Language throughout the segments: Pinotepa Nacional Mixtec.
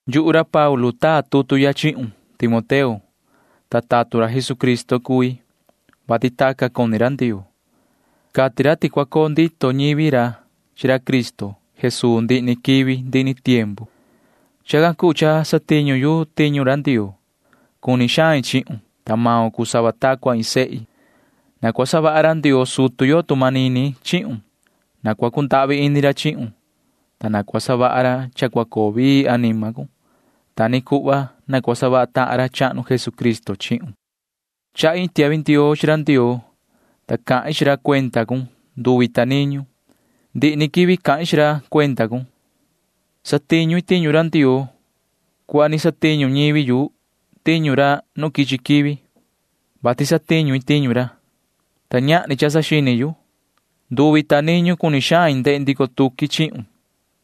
Yuhu ra Paulu taa tutu ya chihun, yoho Timoteo, ta tatun ra Jesucristo cui, vati tacan cuni ra Ndioo. Cati ra ti cua coo ndito ñivi ra chi ra Cristo Jesuu ndihi ni quivi ndihi ni tiempu. [Chacan cuu cha satiñu yu tiñu ra Ndioo.] Cuni xain chihun, ta maun cuu sava ta cua iin sehi. Na cua savaha ra Ndioo sutu yo tu manini chihun. Na cua cundahvi ini ra chihun, ta na cua savaha ra cha cua coo vii anima cun. Ta ni cuhva na cua savaha tahan ra chahnu Jesucristo chihun. Chahi iin tiahvi ndioo chi ra Ndioo, ta cahin chi ra cuenda cun nduvi ta niñu. Ndihi ni quivi cahin chi ra cuenda cun. Satiñu i tiñu Ndioo cuhva ni satiñu ñivi yu tiñu ra nu quichi quivi, vati satiñu i tiñu ra, ta ñahni cha saxini yu. Nduvi ta niñu cuni xain ndehe ndico tuqui chihun,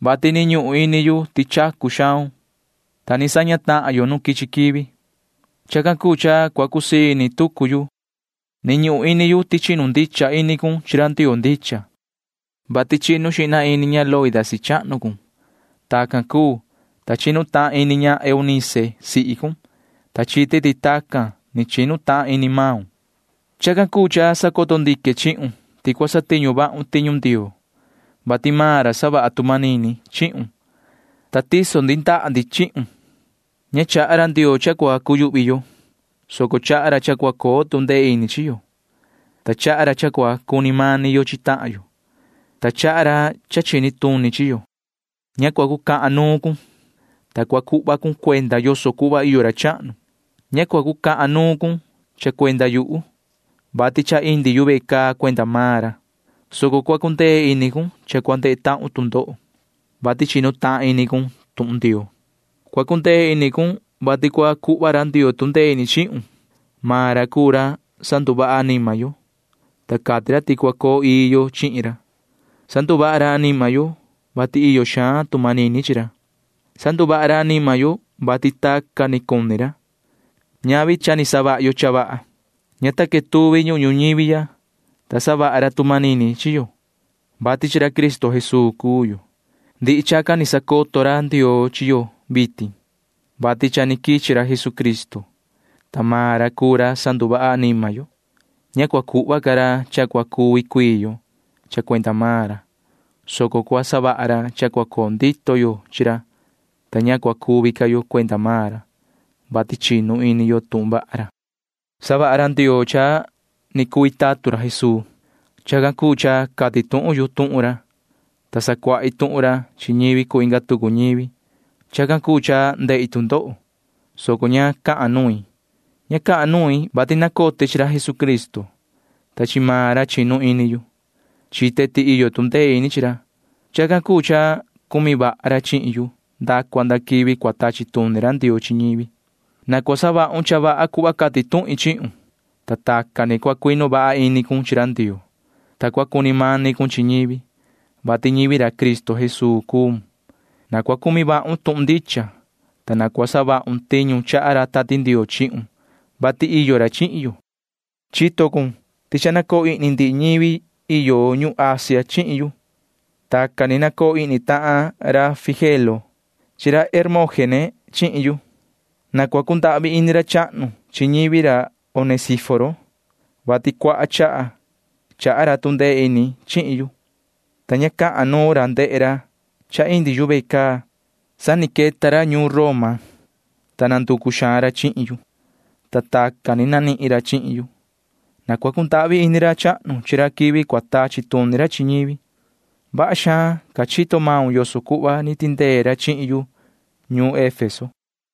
vati ni ñuhun ini yu ti chacu xaun, [ta ni saña tahan yo nu quichi quivi]. Chacan cuu cha cua cusii ini tucu yu. Ni ñuhun ini yu ti chinu ndicha ini cun chi ra Ndioo ndicha, vati chinu xihna ini ña Loida sihi chahnu cun. Tacan cuu, ta chinu tahan ini ña Eunice sihi cun, ta chite ti tacan ni chinu tahan ini maun. Chacan cuu cha sacoto ndique chihun ti cua satiñu vahun tiñu Ndioo, vati maan ra savaha tu manini chihun, ta tiso ndi ndaha ndi chihun. Ña chaha ra Ndioo cha cua cuyuhvi yo, soco chaha ra cha cua coo tu ndee ini chi yo, ta chaha ra cha cua cuni mani yo chi tahan yo, ta chaha ra cha chini tuni chi yo. Ña cua cucahan nuun cun, ta cua cuhva cun cuenda yoso cuhva iyo ra chahnu. Ña cua cucahan nuun cun cha cuenda yuhu, vati cha indi yu ve caa cuenda maan ra, soco cua cundee ini cun cha cua ndehe tahun tu ndoho, vati chinu tahan ini cun tuhun Ndioo. Cua cundee ini cun, vati cua cuhva ra Ndioo tu ndee ini chihun. Maan ra cuu ra sanduvaha anima yo, ta cati ra ti cua coo ii yo chihin ra. Sanduvaha ra anima yo, vati iyo xaan tu manini chi ra. Sanduvaha ra anima yo, vati tacan ni cuni ra. Ñavi ti cha ni savaha yo cha vaha. Ña ta quetuvi ñuhun ñuñivi ya, ta savaha ra tu manini chi yo, vati chi ra Cristo Jesuu cuu yo. Ndihi chacan ni sacoto ra Ndioo chi yo vitin, vati cha ni quichi ra Jesucristo, ta maan ra cuu ra sanduvaha anima yo. Ña cua cuhva ca ra cha cua cuvi cuii yo cha cuenda maan ra, soco cua savaha ra cha cua coo ndito yo chi ra, ta ña cua cuvi ca yo cuenda maan ra, vati chinu ini yo tuhun vaha ra. Savaha ra Ndioo cha ni cui tatun ra Jesuu. Chacan cuu cha cati tuhun yu tuhun ra, ta sacuahi tuhun ra chi ñivi cuu inga tucu ñivi. Chacan cuu cha ndehi tu ndoho, soco ña cahan nuin. Ña cahan nuin, vati nacote chi ra Jesucristo, ta chi maan ra chinu ini yu. Chite ti iyo tu ndee ini chi ra. Chacan cuu cha cumi vaha ra chihin yu nda cua nda quivi cua tachi tuni ra Ndioo chi ñivi. Na cua savahun cha vaha cuhva cati tuhin chihun, ta tacan ni cua cuinu vaha ini cun chi ra Ndioo, ta cua cuni mani cun chi ñivi, vati ñivi ra Cristo Jesuu cuun. Na cua cumi vahun tuhun ndicha, ta na cua savahun tiñu chaha ra Tati Ndioo chihun, vati iyo ra chihin yo. Chito cun ti cha nacoo ihni ndihi ñivi iyo ñuhun Asia chihin yu. Tacan ni nacoo ihni tahan ra Figelo chi ra Hermógene chihin yu. Na cua cundahvi ini ra chahnu chi ñivi ra Onesíforo, vati cuaha chaha chaha ra tu ndee ini chihin yu, ta ña cahan nuun ra ndehe ra cha indi yu ve caa. Sa ni queta ra ñuun Roma, ta nanducu xaan ra chihin yu, ta tacan ni nanihin ra chihin yu. Na cua cundahvi ini ra chahnu chi ra quivi cua tachi tuni ra chi ñivi. Vaha xaan ca chito maun yoso cuhva ni tindee ra chihin yu ñuun Efeso.